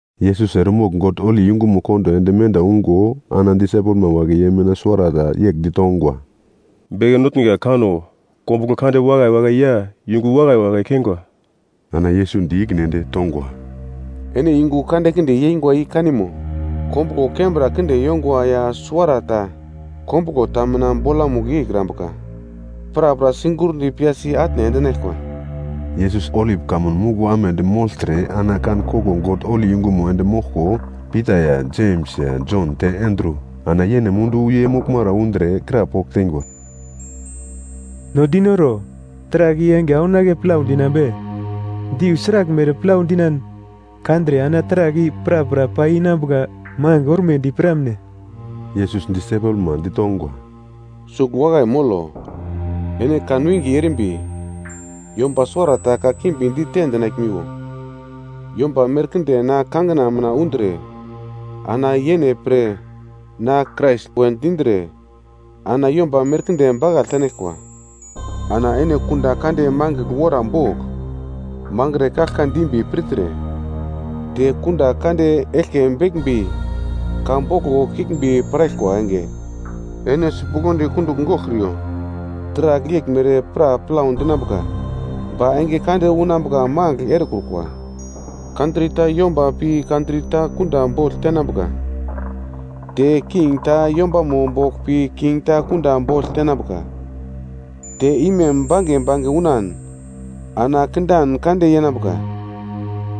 Yesus eremogl God holi yungumo kondo ende menda ungo ana disaipelma wagle ye mina suwara ta yegl ditongwa, “Beke Notnga, kano! Kombuglo kande wakai wakai ya yungu wakai wakai keingwa.” Ana Yesus di ikine ende tongwa, “Ene yungu kandekinde yeingwa i kanimo? Kombuglo kembra kinde yongwa ya suwarata, kombuglo ta mina bolamugl yeikrambuka, prapra sigurndi piyasi atne endinaglkwa.” Yesus Olip Kamun Muglo amedi mogltre ana kan koglo God holi yungumo ende moglko, Pita ya, Jems ya, Jon te Andru, ana yene mundu ye moglmara undre krapogl teingwa, “No dinoro, taragl i enge aunake plau dinambe? Deu sraglmere plau dinan kandre ana taragl i prapra pai inambuka magl ormedi piramne?” Yesus disaipelma ditongwa, “Sugl wakai molo. Ene kanwinge erimbi yomba suwarata kakimbi dite dinaglmiwo. Yomba merkinde na kangina mina undre ana yene pre, na Krais we dindre ana yomba merkinde bakagl tenaglkwa. Ana ene kunda kande mangigl wora bogl mangre kaglka dimbi pirtre, te kunda kande eglke beglmbi ka boglo kiglmbi piraglkwa enge, ene sipuglodi kundugl goglkriyo. Taragl yeglmere pra plau dinambuka, ba enge kande unambuka magl erekrukwa. Kantri ta yomba pi kantri ta yomba kunda bogl tenambuka. Te king ta yombamo bogl pi king ta kunda bogl tenambuka. Te imem bange bange unan ana kindan kande yenambuka.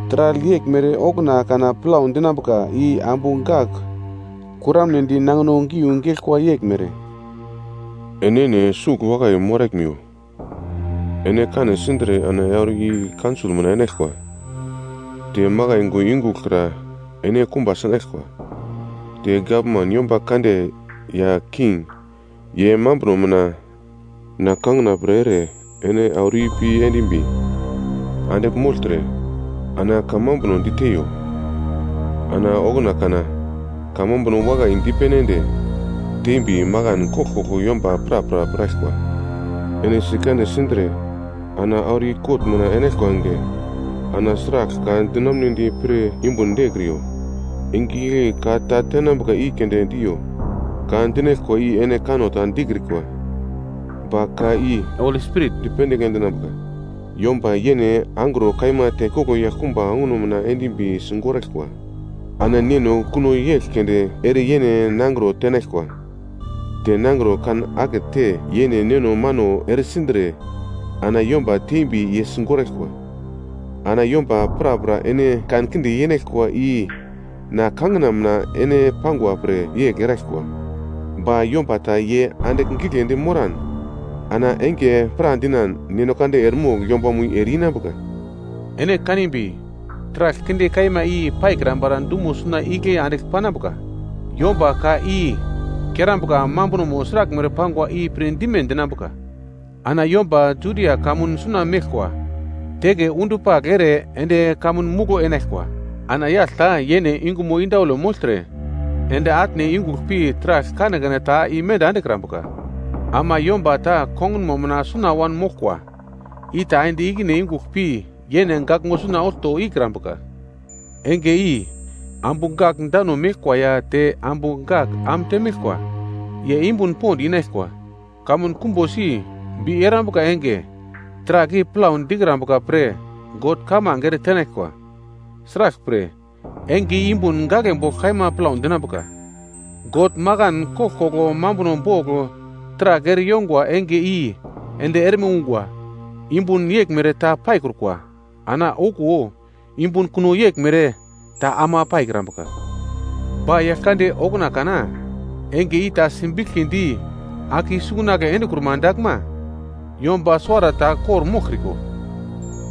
Taragl yeglmere okuna kana plau dinambuka i ambu gak kuramnedi nangino giu geglkwa yeglmere. “Ene enene sugl wakai moraglmiwo. Ene kane sindre ana auro i kaunsol mina enaglkwa. Te makai yungu yungugl kra ene kumba sinaglkwa. Te gavman yomba kande ya king ye mambro mina na kangina pre ere ene auro ipi endimbi andigl mogltre, ana kamambuno diteiyo. Ana okuna kana kamambuno wakai dipene ende tembi makan koglkoglo yomba prapra piraglkwa. Ene sikane sindre ana auro i kot mina enaglkwa enge, ana sragl ka dinamunedi pir yumbun dekriyo. Enge igle ka ta tenambuka i keunde diyo, ka dinaglkwa i ene kanno ta dikrikwa, ba ka i Holi Spirit dipendigl endinambuka. “Yomba yene angro kaima tekoglo yaglkumba onguno mina endimbi sigoraglkwa, ana neno kuno yegl keunde ere yene nangro tenaglkwa. Te nangro kan akete yene neno mano ere sindre ana yomba tembi ye sigoraglkwa. Ana yomba prapra ene kankinde yenaglkwa i na kangina ene mina pangwa pre yegl eraglkwa. Ba yomba ta ye andigl giglendi moran ana enge pradinan God eremogl yombamo i ereinambuka. “Ene kanimbi taragl kinde kaima i paikrambara dumo suna igle andigl panambuka. (Yomba ka i kerambuka mambuno sraglmere pangwa i pir dime dinambuka.) Ana yomba Judia kamun suna meglkwa, teke undupagl ere ende kamun muglo enaglkwa. Ana yagl ta yene yungumo indaule mogltre ende atne yungugl pi taragl kanekane ta imenda endekrambuka. Ama yomba ta kongunmo mina suna wanmoglkwa, i ta ende ikine yungugl pi yene gaglmo suna olto ikrambuka. Enge i ambu gak dano meglkwa ya te ambu gak am temeglkwa, ye yumbun pond inaglkwa. Kamun kumbosi bi erambuka enge, taragl i plau dikrambuka pre God kamange ere tenaglkwa. Sraglpre, enge i yumbun gaglebogl kaima plau dinambuka, God makan koglkoglo mambuno bogl taragl ere yongwa enge i ende erme ungwa, yumbun yeglmere ta paikrukwa. Ana okuwo yumbun kuno yeglmere ta ama paikrambuka. Ba Yaglkande okuna kana enge i ta simbiglkidi ake i-sungunagle endekruma daglma, yomba suwarata kor-moglkriko,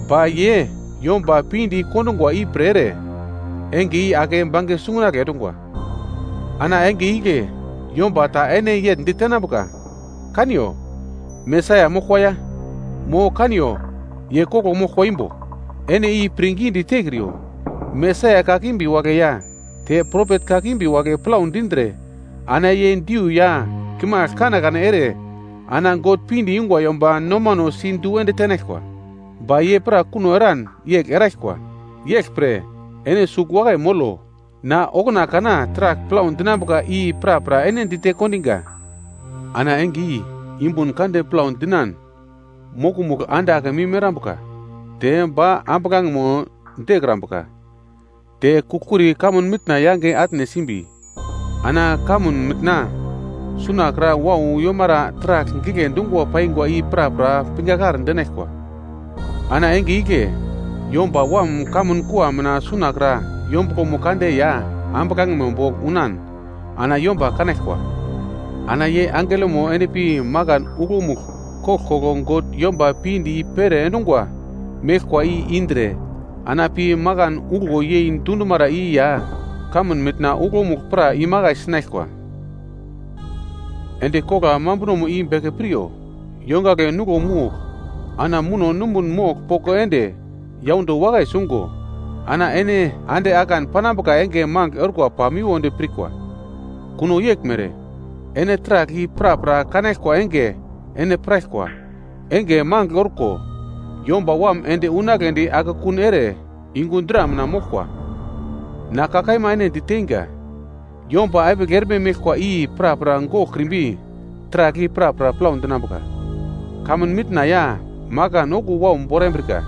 ba ye yomba pinde i-kondungwa ipre ere, enge i ake bange sungunagle endungwa. Ana enge igle yomba ta ene yegl ditenambuka, ‘Kaniyo, Mesaia moglkwa ya!’ Mo, ‘Kaniyo, ye koglo moglkwa imbo.’ Ene i pirngidi tekriyo. Mesaia kakimbi wagle ya te propet kakimbi wagle plau dindre ana ye diu ya kimagl kanekane ere ana God pinde yungwa yomba nomano si du ende tenaglkwa. Ba ye pra kuno eran yegl eraglkwa. Yeglpre ene sugl wakai molo, na okuna kana taragl plau dinambuka i prapra ene dite kondinga. “Ana enge i yumbun kande plau dinan mokomugl “‘ande akemim erambuka, te ba ambuglangemo dekrambuka. Te kugl-kuri kamun mitna yange atne simbi, ana kamun mitna suna kra wau yomara taragl gigle dungwa paingwa i prapra pingakar dinaglkwa.’ “Ana enge igle Yomba Wam kamun kua mina sunakra yombuglomo kande ya ambuglangemo bogl unan ana yomba kanaglkwa. Ana ye angelomo endpi makan uglomugl koglkoglo God yomba pinde i-pere endungwa meglkwa i indre, ana pi makan uglo yei dundumara i ya kamun mitna uglomugl pra imakai sinaglkwa. “Endi kogla mambunomo i beke piryo, yongagle nuglo mogl ana muno numbun mogl poko ende yaundo wakai sungo ana ene ande akan panambuka enge magl orkwa pamiwodi pirkwa. Kuno yeglmere, ene taragl i prapra kanaglkwa enge ene piraglkwa, enge magl orko Yomba Wam ende unagledi akekun ere yungu dra mina moglkwa. Na ka kaima ene diteinga, yomba epigl erme meglkwa i prapra goglkrimbi taragl i prapra plau dinambuka. Kamun mitna ya makan okuwo wau borambrika.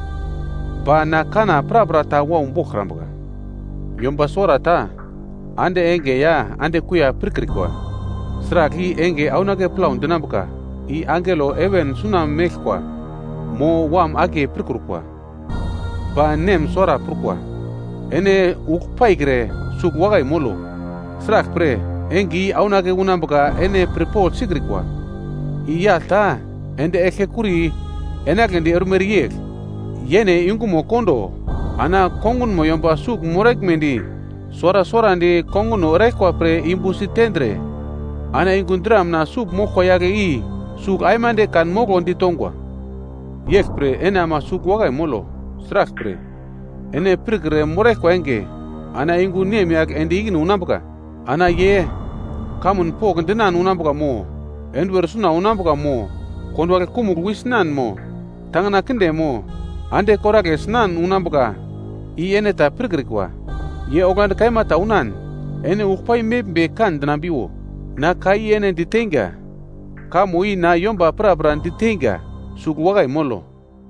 Ba na kanna prapra ta wau boglkrambuka. “Yomba suwarata ande enge ya ande kuiya pirkrikwa. Sragl i enge aunake plau dinambuka, i angelo heven suna meglkwa, mo Wam akiye pirkrukwa. Ba Nem suwara prukwa. Ene ugl paikre sugl wakai molo, sraglpre enge i aunake unambuka ene pirpogl sikrikwa. I yagl ta ende eglkekuri enagledi ormere yegl, yene yungumo kondo ana kongunmo yomba sugl moraglmedi suwara suwarandi konguno eraglkwa pre yumbu sitendre, ana yungu dra mina sugl moglkwa yagle i sugl aimande kanmoglo ditongwa. “Yeglpre ene ama sugl wakai molo, sraglpre, ene pirkre moraglkwa enge ana yungu nemyagl ende ikine unambuka. Ana ye kamun pokndinan unambuka mo, enduwer suna unambuka mo, konduwagle kumugl wi sinan mo, tangina kinde mo, ande koragle sinan unambuka, i ene ta pirkrikwa. Ye oglandi kaima ta unan, ene ugl pai meglmbi kan-dinambiwo. Na ka i ene diteinga, kamo i na yomba prapra diteinga, ‘Sugl wakai molo!’”